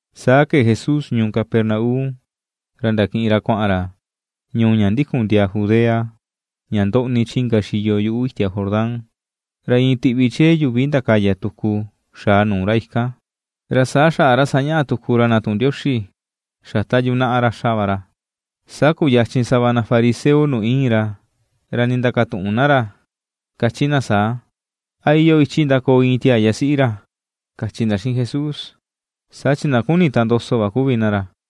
Saa kee Jesús ñuu Capernaum, ra ndakiꞌin ra kuaꞌan ra ñuu ña ndikun ndiaa Judea, ña ndoꞌni chi inka xiyo yuꞌu itia Jordán. Ra iin tiꞌvi chee yuvi ndakaya tuku xaa nuu ra ikan, ra saa xaꞌa ra sañaꞌa tuku ra na tuꞌun Ndioxi, xa ta yunaꞌa ra xa va ra. Saa kuyachin sava na fariseo nuu iin ra, ra ndindakatuꞌun na ra kachi na saa: ―¿A iyoo ichi ndakoo iin tiaa yasiꞌi ra? ―kachi na xiꞌin Jesús, saa chin na kuni tandoso va kuvi na ra.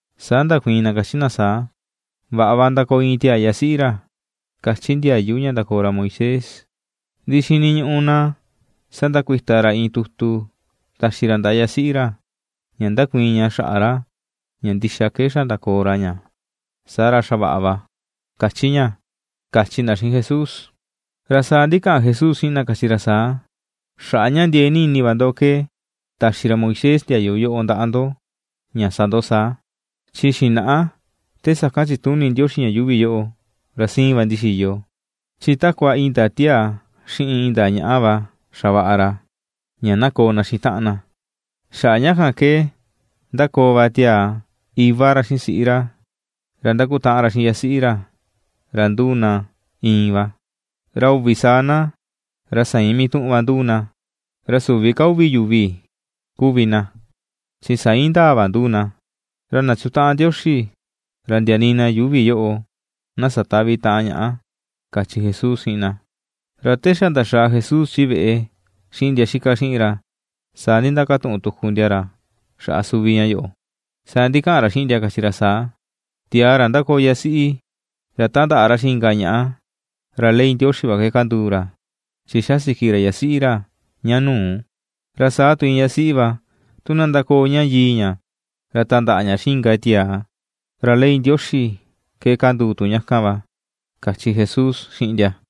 Saa ndakuiin na kachi na saa: ―Vaꞌa va ndakoo iin tiaa yasiꞌi ra kachi ndiayu ña ndakoo ra Moisés, ndi xiniñuꞌu na sandakuita ra iin tutu taxi ra ndaꞌa yasiꞌi ra, ña ndakuiin ña xaꞌa ra, ña ndixa ke xa ndakoo ra ña, saa ra xa vaꞌa va kachi ña ―kachi na xiꞌin Jesús. Ra saa ndikaꞌan Jesús xiꞌin na kachi ra saa: ―Xaꞌa ña ndiee ni ini va ndo ke taxi ra Moisés ndiayu yoꞌo ndaꞌa ndo ña sa ndo saa. Chi xinaꞌa te sakan chituni Ndioxi ña yuuvi yoꞌo, ra siin va ndixiyo. Chi takua iin ndaa tiaa xiꞌin iin ndaa ñaꞌa va xavaꞌa ra ña na koo na xiꞌin taꞌan na. Xaꞌa ña kan ke ^ndakoo va tiaa iva ra xiꞌin siꞌi ra, ra ^ndakutaꞌan ra xiꞌin yasiꞌi ra, ra ^nduu na iin va. Ra uvi saa na ra sa iin mituꞌun va yuvi nduu na, ra süvi ka uvi yuvi kuvi na, chi sa iin ndaa va nduu na. Ra na chutaꞌan Ndioxi, ra ndia nii na yuuvi yoꞌo na satäꞌvi taꞌan ñaꞌa ―kachi Jesús xiꞌin na. Ra te xa ndaxaa Jesús chi veꞌe xiꞌin ndia xika xiꞌin ra, saa ndindakatuꞌun tuku ndia ra xaꞌa suvi ña yoꞌo. Saa ndikaꞌan ra xiꞌin ndia kachi ra saa: ―Tiaa ra ndakoo yasiꞌi, ra tandaꞌa ra xiꞌin inka ñaꞌa, ra ley Ndioxi va ke kanduu ra, chi xasiki ra yasiꞌi ra ña nuu. Ra saa tu iin ña siꞌi va, tu na ndakoo ña yii ña, ra tandaꞌa ña xiꞌin inka tiaa, ra ley Ndioxi ke kanduu tu ña kan va ―kachi Jesús xiꞌin ndia.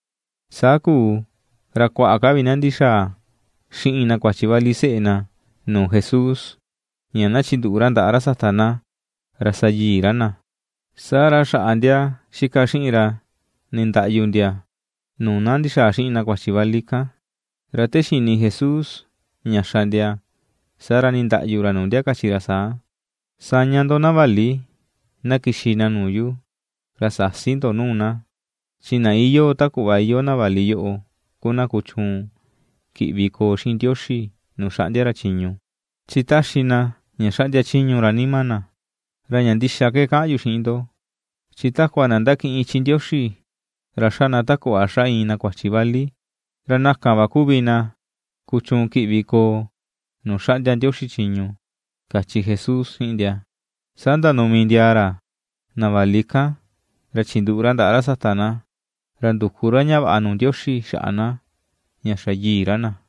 Saa kuu ra kuaꞌa ka vi na ndixaa xiꞌin na kuachi vali seꞌe na nuu Jesús ña na chinduꞌu ra ndaꞌa ra sata na, ña sa yii ra na. Saa ra xaꞌa ndia xika xiꞌin ra nindaꞌyu ndia nuu na ndixaa xiꞌin na kuachi vali kan. Ra te xini Jesús ña xa ndia, saa ra nindaꞌyu ra nuu ndia kachi ra saa: ―Saña ndo na vali, na kixi na nuu yu, ra säsi ndo nuu na, chi na iyoo ta kuꞌva iyoo na vali yoꞌo ku na kuchuun kiꞌvi koo xiꞌin Ndioxi nuu xaꞌndia ra chiñu chi taxi na ña xaꞌndia chiñu ra nima na. Ra ña ndixa ke kaꞌan yu xiꞌin ndo, chi takua na ndakiꞌin ichi Ndioxi ra xa na ta kuꞌva xa iin na kuachi vali, ra na kan va kuvi na kuchuun kiꞌvi koo nuu xaꞌndia Ndioxi chiñu ―kachi Jesús xiꞌin ndia. Saa ndanumi ndiaa ra na vali kan ra chinduꞌu ra ndaꞌa ra sata na, ra nduku ra ña vaꞌa nuu Ndioxi xaꞌa na, ña xa yii ra na.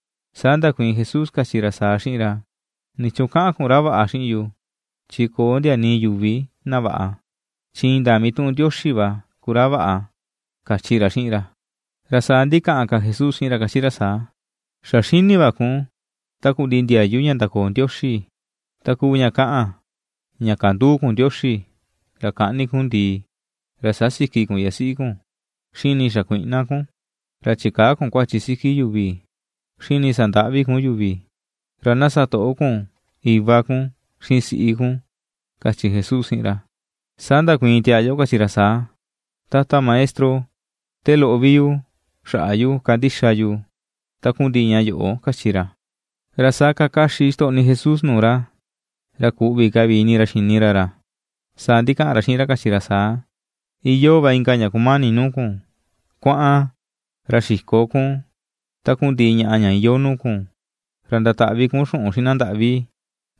Saa ndakuiin Jesús kachi ra saa xiꞌin ra: ―¿Nichuun kaꞌan kun ra vaꞌa xiꞌin yu? Chi köo ndia nii yuvi na vaꞌa, chi indaa mituꞌun Ndioxi va ku ra vaꞌa, ―kachi ra xiꞌin ra. Ra saa ndikaꞌan ka Jesús xiꞌin ra kachi ra saa: ―Xa xini va kun takundiꞌi ndiayu ña ndakoo Ndioxi, takuu ña kaꞌan ña kandüu kun Ndioxi, ra käꞌni kun ndìì, ra sasïki kun yasiꞌi kun, xiꞌin nii xakuïꞌna kun, ra chikäa kun kuachi siki yuvi, xiꞌin nii sandäꞌvi kun yuvi, ra na satoꞌo kun iva kun xiꞌin siꞌi kun, ―kachi Jesús xiꞌin ra. Saa ndakuiin tiaa yoꞌo kachi ra saa: ―Tata Maestro, te loꞌo vi yu xaꞌa yu kandixa yu takundiꞌi ña yoꞌo ―kachi ra. Ra saa kakaxi ixtoꞌni Jesús nuu ra, ra ku̱ꞌvi̱ ka vi ini ra xini ra ra, saa ndikaꞌan ra xiꞌin ra kachi ra saa: ―Iyoo va inka ña kumani nuu kun: Kuaꞌan, ra xiko kun takundiꞌi ñaꞌa ña iyoo nuu kun, ra ndataꞌvi kun xuꞌun xiꞌin na ndaꞌvi,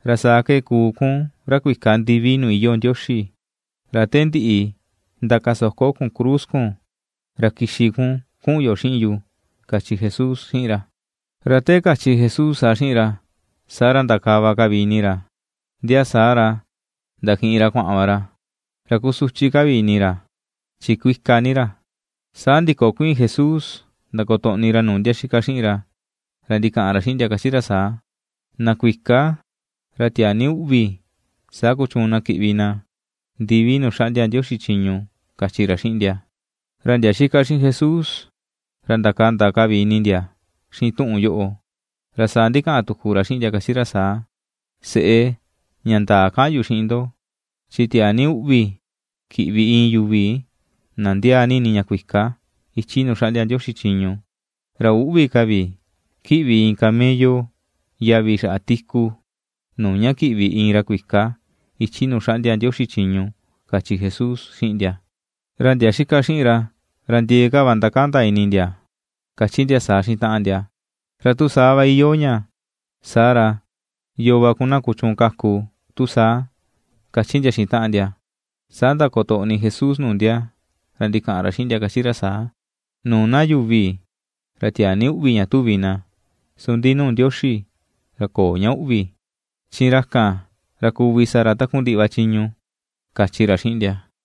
ra saa ke kuu kun ra kuika ndivi nuu iyoo Ndioxi, ra te ndiꞌi ndakasoko kun cruz kun ra kixi kun kuꞌun yo xiꞌin yu ―kachi Jesús xiꞌin ra. Ra te kachi Jesús saa xiꞌin ra, saa ra, ndakava ka vi ini ra, ndia saa ra, ndakiꞌin ra kuaꞌan va ra, ra kusuchi ni ini ra chi kuika ni ra. Saa ndikokuiin Jesús ra ndakotoꞌni ra nuu ndia xika xiꞌin ra, ra ndikaꞌan ra xiꞌin ndia, kachi ra saa: ―Na kuika, ra tiaa ni uꞌvi saa kuchuun na kiꞌvi na ndivi nuu xaꞌndia Ndioxi chiñu ―kachi ra xiꞌin ndia. Ra ndia xika xiꞌin Jesús ra ndakanda ka vi ini ndia xiꞌin tuꞌun yoꞌo, ra saa ndikaꞌan tuku ra xiꞌin ndia kachi ra saa: ―Seꞌe, ña ndaa kaꞌan yu xiꞌin ndo, chi tiaa ni uꞌvi kiꞌvi iin yuvi na ndiaa ni ini ña kuika ichi nuu xaꞌndia Ndioxi chiñu. Ra üꞌvi ka vi kiꞌvi iin camello yavi xaꞌa tiku, nuu ña kiꞌvi iin ra kuika ichi nuu xaꞌndia Ndioxi chiñu ―kachi Jesús xiꞌin ndia. Ra ndia xika xiꞌin ra, ra ndiee ka va ndakanda ini ndia, kachi ndia saa xiꞌin taꞌan ndia: ―Ra tu saa va iyoo ña, saa ra, ¿yoo va ku na kuchuun kaku tu saa? ―kachi ndia xiꞌin taꞌan ndia. Saa ndakotoꞌni Jesús nuu ndia, ra ndikaꞌan ra xiꞌin ndia kachi ra saa: ―Nuu na yuvi, ra tiaa ni va uꞌvi ña tuvi na, su ndi nuu Ndioxi ra köo ña uꞌvi, chi ra kan ra kuvi sa ra takundiꞌi va chiñu ―kachi ra xiꞌin ndia.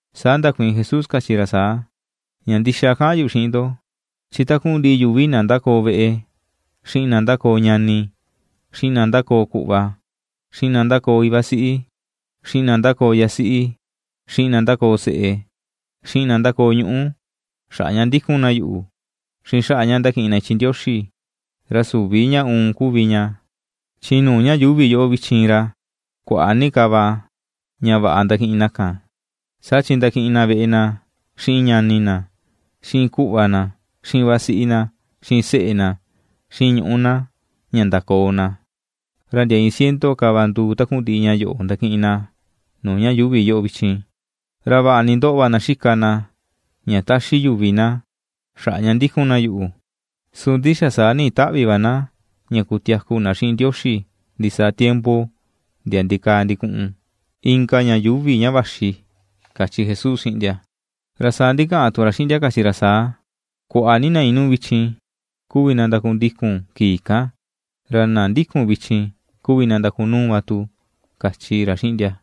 Saa ndakuiin Jesús kachi ra saa: ―Ña ndixa kaꞌan yu xiꞌin ndo, chi takundiꞌi yuvi na ndakoo veꞌe, xiꞌin na ndakoo ñani, xiꞌin na ndakoo kuꞌva, xiꞌin na ndakoo iva siꞌi, xiꞌin na ndakoo yasiꞌi, xiꞌin na ndakoo seꞌe, xiꞌin na ndakoo ñuꞌu, xaꞌa ña ^ndíku̱n na yuꞌu, xiꞌin xaꞌa ña ndakiꞌin na ichi Ndioxi, ra süvi ña uun kuvi ña, chi nuu ña yuuvi yoꞌo vichin ra kuaꞌa ni ka va ña vaꞌa ndakiꞌin na kan. Saa chi ndakiꞌin na veꞌe na xiꞌin ñani na xiꞌin kuꞌva na xiꞌin vasiꞌi na xiꞌin seꞌe na xiꞌin ñuꞌu na, ña ndakoo na; ra ndia iin ciento ka va nduu takundiꞌi ña yoꞌo ndakiꞌin na nuu ña yuuvi yoꞌo vichin. Ra vaꞌa ni ndoꞌo va na xika na ña taxi yuvi na xaꞌa ña ndikun na yuꞌu, su ndi xa saa ni̱ꞌi̱ taꞌvi̱ va na ña kutiaku na xiꞌin Ndioxi ndisaa tiempo ndia ndikaa ndikuꞌun, inka ña yuuvi ña vaxi ―kachi Jesús xiꞌin ndia. Ra saa ndikaꞌan tu ra xiꞌin ndia, kachi ra saa: ―Kuaꞌa ni na inuu vichin kuvi na ndakundikun kii kan, ra na ^ndíku̱n vichin kuvi na ndakunuu va tu ―kachi ra xiꞌin ndia.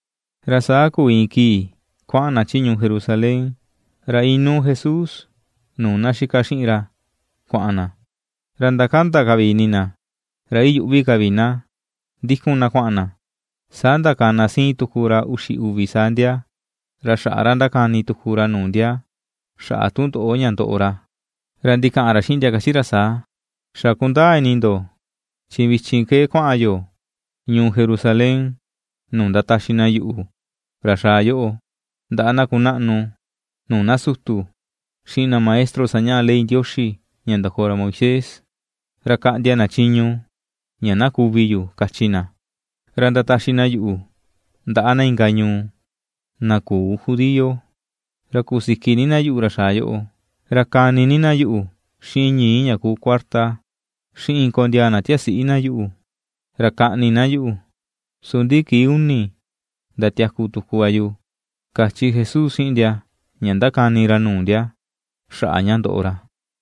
Ra saa kuu iin kii kuaꞌan na chi ñuu Jerusalén, ra inuu Jesús nuu na xika xiꞌin ra kuaꞌan na, ra ndakanda ka vi ini na ra iyuꞌvi ka vi na ndikun na kuaꞌan na. Saa ndakana siin tuku ra uxi uvi saa ndia, ra xaꞌa ra ndakani tuku ra nuu ndia xaꞌa tundoꞌo ña ndoꞌo ra. Ra ndikaꞌan ra xiꞌin ndia kachi ra saa: ―Xa kundaa ini ndo chi vichin ke kuaꞌan yo ñuu Jerusalén, nuu ndataxi na yuꞌu, ra xaa yoꞌo, ndaꞌa na kunaꞌnu nuu na sutu, xiꞌin na maestro sañaꞌa ley Ndioxi ña ndakoo ra Moisés. Ra kaꞌndia na chiñu ña na kuvi yu kachi na, ra ndataxi na yuꞌu ndaꞌa na inka ñuu, na küu judío, ra kusiki ni na yuꞌu, ra xaa yoꞌo, ra kani na yuꞌu xiꞌin ñii̱ ña ku kuarta, xiꞌin kondiaa na tiasiꞌi na yuꞌu, ra kaꞌni na yuꞌu, ndi su kii uni ndatiaku tuku va yu ―kachi Jesús xiꞌin ndia ña ndakani ra nuu ndia, xaꞌa ña ndoꞌo ra.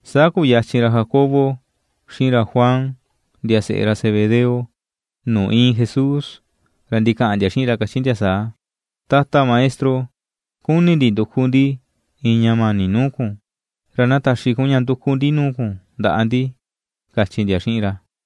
Saa kuyachin ra Jacobo xiꞌin ra Juan ndia seꞌe ra Zebedeo nuu iin Jesús, ra ndikaꞌan ndia xiꞌin ra kachi ndia saa: ―Tata Maestro, kuni̱ ndi nduku ndi iin ña mani̱ nuu kun, ra na taxi kun ña nduku ndi nuu kun ndaꞌa ndi ―kachi ndia xiꞌin ra.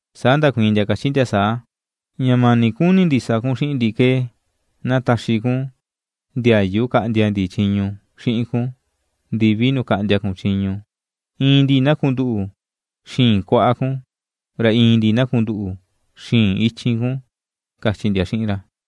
Saa ndakuiin ndia kachi ndia saa: ―Ña mani̱ kuni ndi sa kun xiꞌin ndi ke na taxi kun ndiayu kaꞌndia ndi chiñu xiꞌin kun nuu kaꞌndia kun chiñu; iin ndi na kunduꞌu xii̱n kuaꞌa kun, ra iin ndi na kunduꞌu xii̱n ichin kun, ―kachi ndia xiꞌin ra.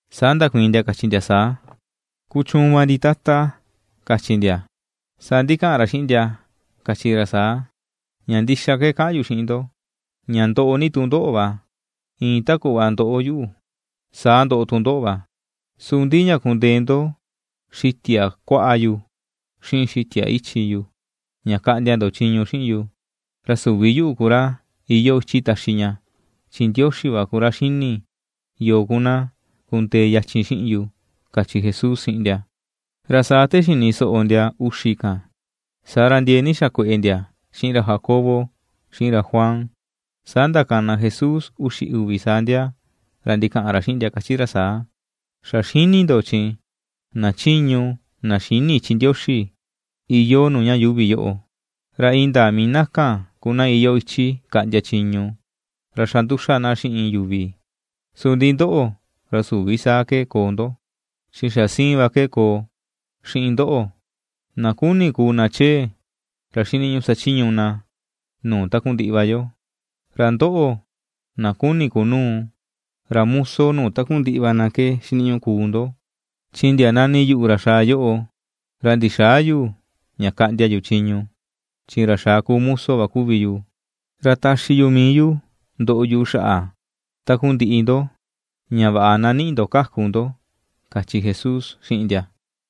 Saa ndakuiin ndia kachi ndia saa: ―Kuchuun va ndi Tata, ―kachi ndia. Saa ndikaꞌan ra xiꞌin ndia kachi ra saa: ―Ña ndixa ke kaꞌan yu xiꞌin ndo, ña ndoꞌo ni tu ndóꞌo̱ va, iin ta kuꞌva ^ndoꞌo yu, saa ndoꞌo tu ndóꞌo̱ va. Su ndi ña kundee ndo xitia kuaꞌa yu xiꞌin xitia ichin yu, ña kaꞌndia ndo chiñu xiꞌin yu, ra süvi yuꞌu ku ra, ra iyoo ichi taxi ña, chin Ndioxi va ku ra xini yoo ku na kundee yachin xiꞌin yu ―kachi Jesús xiꞌin ndia. Ra saa te xini soꞌo ndia uxi kan, saa ra ndiee ni xakueꞌe ndia xiꞌin ra Jacobo xiꞌin ra Juan. Saa ndakana Jesús uxi uvi saa ndia, ra ndikaꞌan ra xiꞌin ndia, kachi ra saa: ―Xa xini ndo chin, na chiñu, na xïni ichi Ndioxi iyoo ña yuuvi yoꞌo, ra indaa mii na kan ku na iyoo ichi kaꞌndia chiñu, ra xanduxa na xiꞌin yuvi. Su ndi ndóꞌo̱, ra süvi saa ke koo ndo, chi xa siin va ke koo xiꞌin ndóꞌo̱: na kuni̱ kuu na chee, ra xiniñuꞌu sachiñu na nuu takundiꞌi va yo. Ra ndóꞌo, na kuni̱ kunuu, ra muso nuu takundiꞌi va na ke xiniñuꞌu kuu ndo. Chi ndia nani yuꞌu, ra xaa yoꞌo, ra ndixäa yu ña kaꞌndia yu chiñu, chi ra xaa ku muso va kuvi yu, ra taxi yu mii yu ndoꞌo yu xaꞌa takundiꞌi ndo, ña vaꞌa na ni̱ꞌi̱ ndo kakù ndo ―kachi Jesús xiꞌin ndia.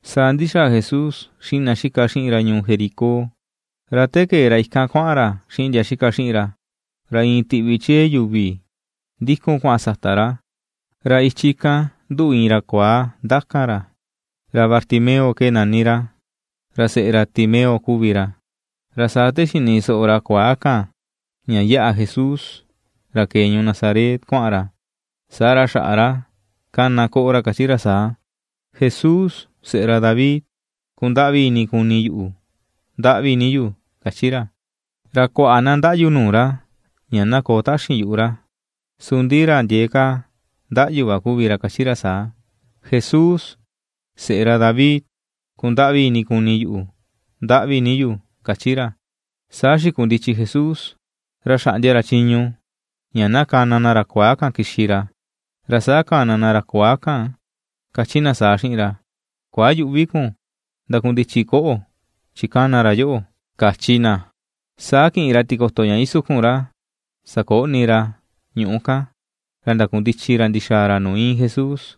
Saa ndixaa Jesús xiꞌin na xika xiꞌin ra ñuu Jericó. Ra te kee ra ikan kuaꞌan ra xiꞌin ndia xika xiꞌin ra, ra iin tiꞌvi chee yuvi ndikun kuaꞌan sata ra, ra ichi kan nduꞌu iin ra kuaa ndakan ra, ra Bartimeo nani ra; ra seꞌe ra Timeo kuvi ra. Ra saa te xini soꞌo ra kuaa kan, ña yaꞌa Jesús, ra kee ñuu Nazaret kuaꞌan ra, saa ra xaꞌa ra kana koꞌo ra kachi ra saa: ―Jesús, Seꞌe ra David, ¡kundaꞌvi ini kuni yuꞌu! ¡Ndaꞌvi ni yu! ―kachi ra. Ra kuaꞌa na ndaꞌyu nuu ra ña na koo taxin yuꞌu ra, su ndi ra ndiee ka ndaꞌyu va kuvi ra, kachi ra saa: ―Jesús, Seꞌe ra David, ¡kundaꞌvi ini kuni yuꞌu! ¡Ndaꞌvi ni yu! ―kachi ra. Saa xikundichi Jesús, ra xaꞌndia ra chiñu ña na kana na ra kuaa kan kixi ra. Ra saa kana na ra kuaa kan, kachi na saa xiꞌin ra: ―Kuayüꞌvi kun, ndakundichi koꞌo̱, chi kana ra yoꞌo ―kachi na. Saa kiꞌin ra tikoto ña isukun ra sakoꞌni ra ñuꞌu kan, ra ndakundichi ra ndixaa ra nuu iin Jesús.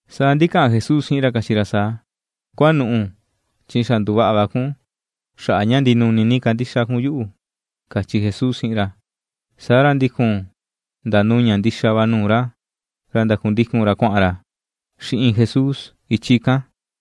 Saa ndikaꞌan Jesús xiꞌin ra kachi ra saa: ―Kuanuꞌu, chi xa nduvaꞌa va kun, xaꞌa ña ndinuni ni ini kun kandixa kun yuꞌu, ―kachi Jesús xiꞌin ra. Saa ra ndikun ndanuña ndixa va nuu ra, ra ndakundikun ra kuaꞌan ra xiꞌin Jesús, ichi kan.